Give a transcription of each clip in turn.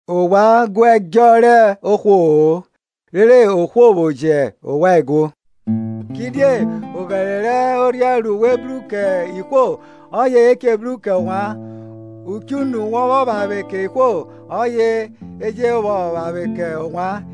Ovwan gu ẹdjọ rẹ ohwo-o, rere ohwo vwo jẹ ovwan eguo. Kidie oghẹre rẹ orhiẹn ru we bru kẹ ihwo, ọye e ji bru kẹ ovwan. Uchunu wọ vwọ vwavwe kẹ ihwo, ọye a je vwọ vwavwe kẹ ovwan.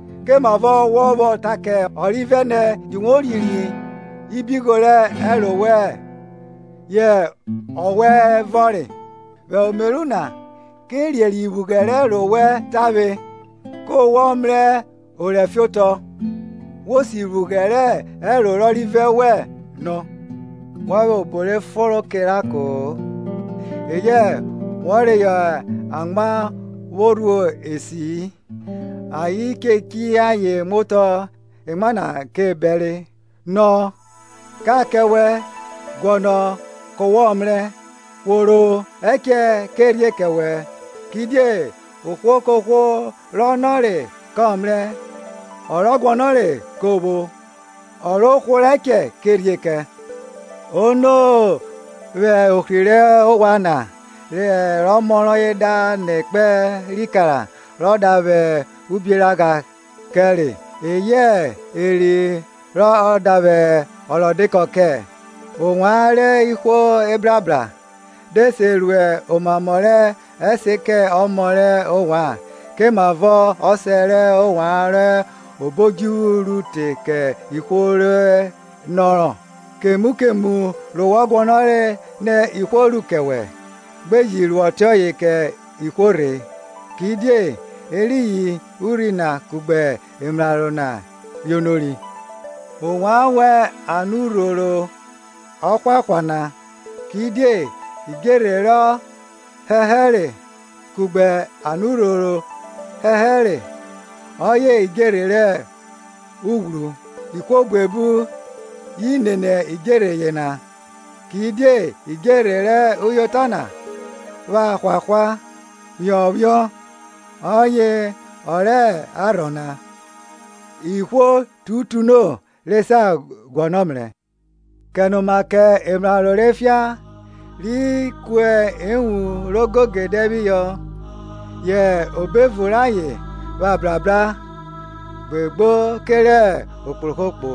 Komavọ wọ vwọ ta kẹ ọrivẹ nẹ, jẹ uvwe ririe iphughẹ rẹ ẹro wẹn, yẹ ọwẹ vọnre? Wẹ omeru na, ke ririẹ iphughẹ rẹ ẹro wẹ tavwe, ku wọ mrẹ orẹ fiotọ vwo si iphughẹ rẹ ẹro rẹ ọrivẹ wẹn nọ. Wọ vwẹ obo re fonro kẹ eranko-o, eyẹ wọ reyọ amwa vwo rhuo esi-i, ayen de chiyi ayen muotọ emwa na ke bẹre. Nọ, ka kẹ wẹ; guọnọ ke wọ mrẹ; hworo ẹchẹ kẹ rhie kẹ wẹ. Kidie ohwo kohwo rọ nọre kọ mrẹ, ọ rọ guọnọre ko vwo, ọ ro hworo ẹchẹ ke rhie kẹ. Ono vwẹ ohri rẹ ovwan na, rẹ ọmọ rọye da nọ ekpẹn rẹ ikara rọ da vwẹ ubioragha kẹ re? Eyẹ eri rọ da vwẹ ọrọdekọ kẹ? Ovwan rẹ ihwo ebrabra, de se ru omamọ rẹ ẹse kẹ emọ rẹ ovwan, komavọ Ọsẹ rẹ ovwan rọ hẹ obo odjuvwu ru te kẹ ihwo re nọrọ? Kemu kemu ru wọ guọnọre nẹ ihwo ru kẹ wẹ, gbe ji ru ọtiọye kẹ ihwo rhe; Kidie eriyin urhi na kugbe emraro na yonori. Ovwan wan anurhoro ọhwahwa na: Kidie idjerhe rọ hẹhẹre kugbe anurhoro ọhẹhẹre ọye idjerhe rẹ oghwọrọ. Ihwo buebu yi nene idjerhe yena. Kidie idjerhe rẹ uyota na pha hwahwa phiọnphiọn, ọye ọ rẹ arhọ na; ihwo tutuno re sa guọnọ mrẹ. Kenoma kẹ emraro rẹ efian ri ku ewun rẹ ogegede phihọ, yẹ obo evun rayen pha brabra gbegbo kerẹ okpohrokpo.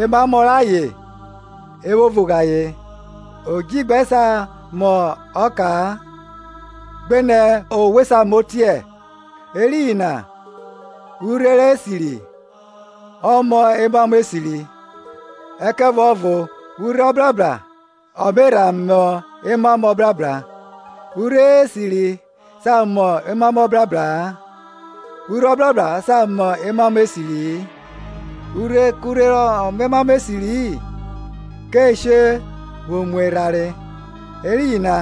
Emamọ rayen e vwo vughe ayen. Odjigbẹ sa mọ ọka, gbenẹ owe sa mọ otiẹ? Eriyin na urhe rẹ esiri, ọ mọ emamọ esiri, ẹkẹvuọvo urhe ọbrabra ọ me rha mọ emamọ ọbrabra. Urhe esiri sa mọ omamọ ọbrabra-a, urhe ọbrabra sa mọ emamọ esiri-i. Urhe kurhe rọ mọ emamọ esiri-i, ke she vwo mu erhanre. Eriyin na,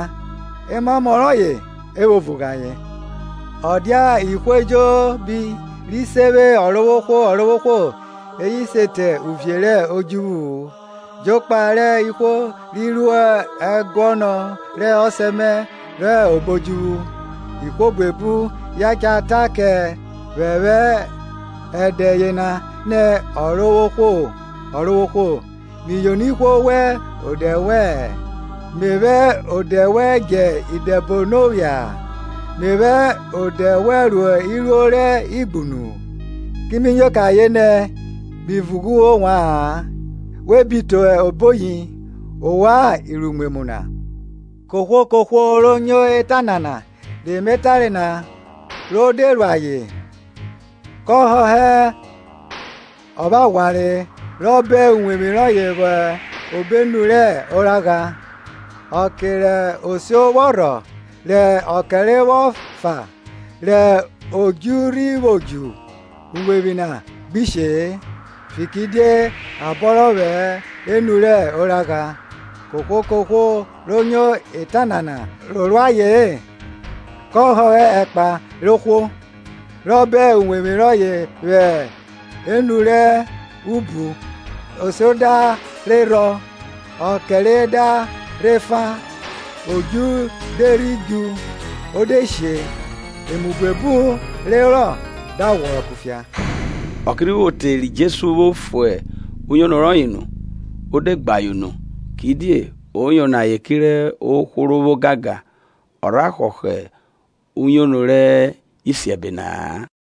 emamọ rayen e vwo vughe ayen. Ọ dia ihwo ejobi ri se vwe Ọrovwohwo, Ọrovwohwo eye se te uvie rẹ odjuvwu-u; jokpa rẹ ihwo ri ru ẹguọnọ rẹ Ọsẹ mẹ rọ hẹ obo odjuvwu. Ihwo buebu ye cha ta kẹ vwẹ vwẹ ẹdẹ yena nẹ, Ọrovwohwo, Ọrovwohwo, mi yono ihwo vwẹ odẹ wẹ, me vwẹ odẹ wẹn djẹ idẹbono phia, me vwẹ odẹ wẹ ru iruo rẹ igbunu?. Ki mi nyo kẹ ayen nẹ, mi vughe ovwa-an, we bi te oboyi, ovwan iruimwemwu na. Kohwo kohwo ro nyo eta nana re me tare na, ro de ru ayen, ko họhọ ọvwẹghwanre rọ bọn uwevwi rọye vwọ hẹ enu rẹ oragha. Ọke rẹ osio vwọ rhọ, rẹ ọkẹre vwọ fa, rẹ odju rhi vwo djuo, uwevwi na gbi she-e, fikiridie a bọnrọ vwọ hẹ enu rẹ oragha. Kohwo kohwo ro nyo eta nana, ro ru aye-en, kọ họhọ ẹkpa rẹ ohwo, rọ bọn uwevwi rọye vwọ hẹ enu rẹ ubu. Osio da rhe rhọ, ọkẹre da rhe fa, odju de rhi djuo, o de she: emu buebu re herọ da ghwọrọ kufia. Ọke rhi vwo te ri Jesu vwo fue uyono rọye nu, o de gbe ayen unu. Kidie o yono ayen kerẹ ohwo ro vwo ogangan, ọ rha họhọ uyono rẹ isiẹbe na-a.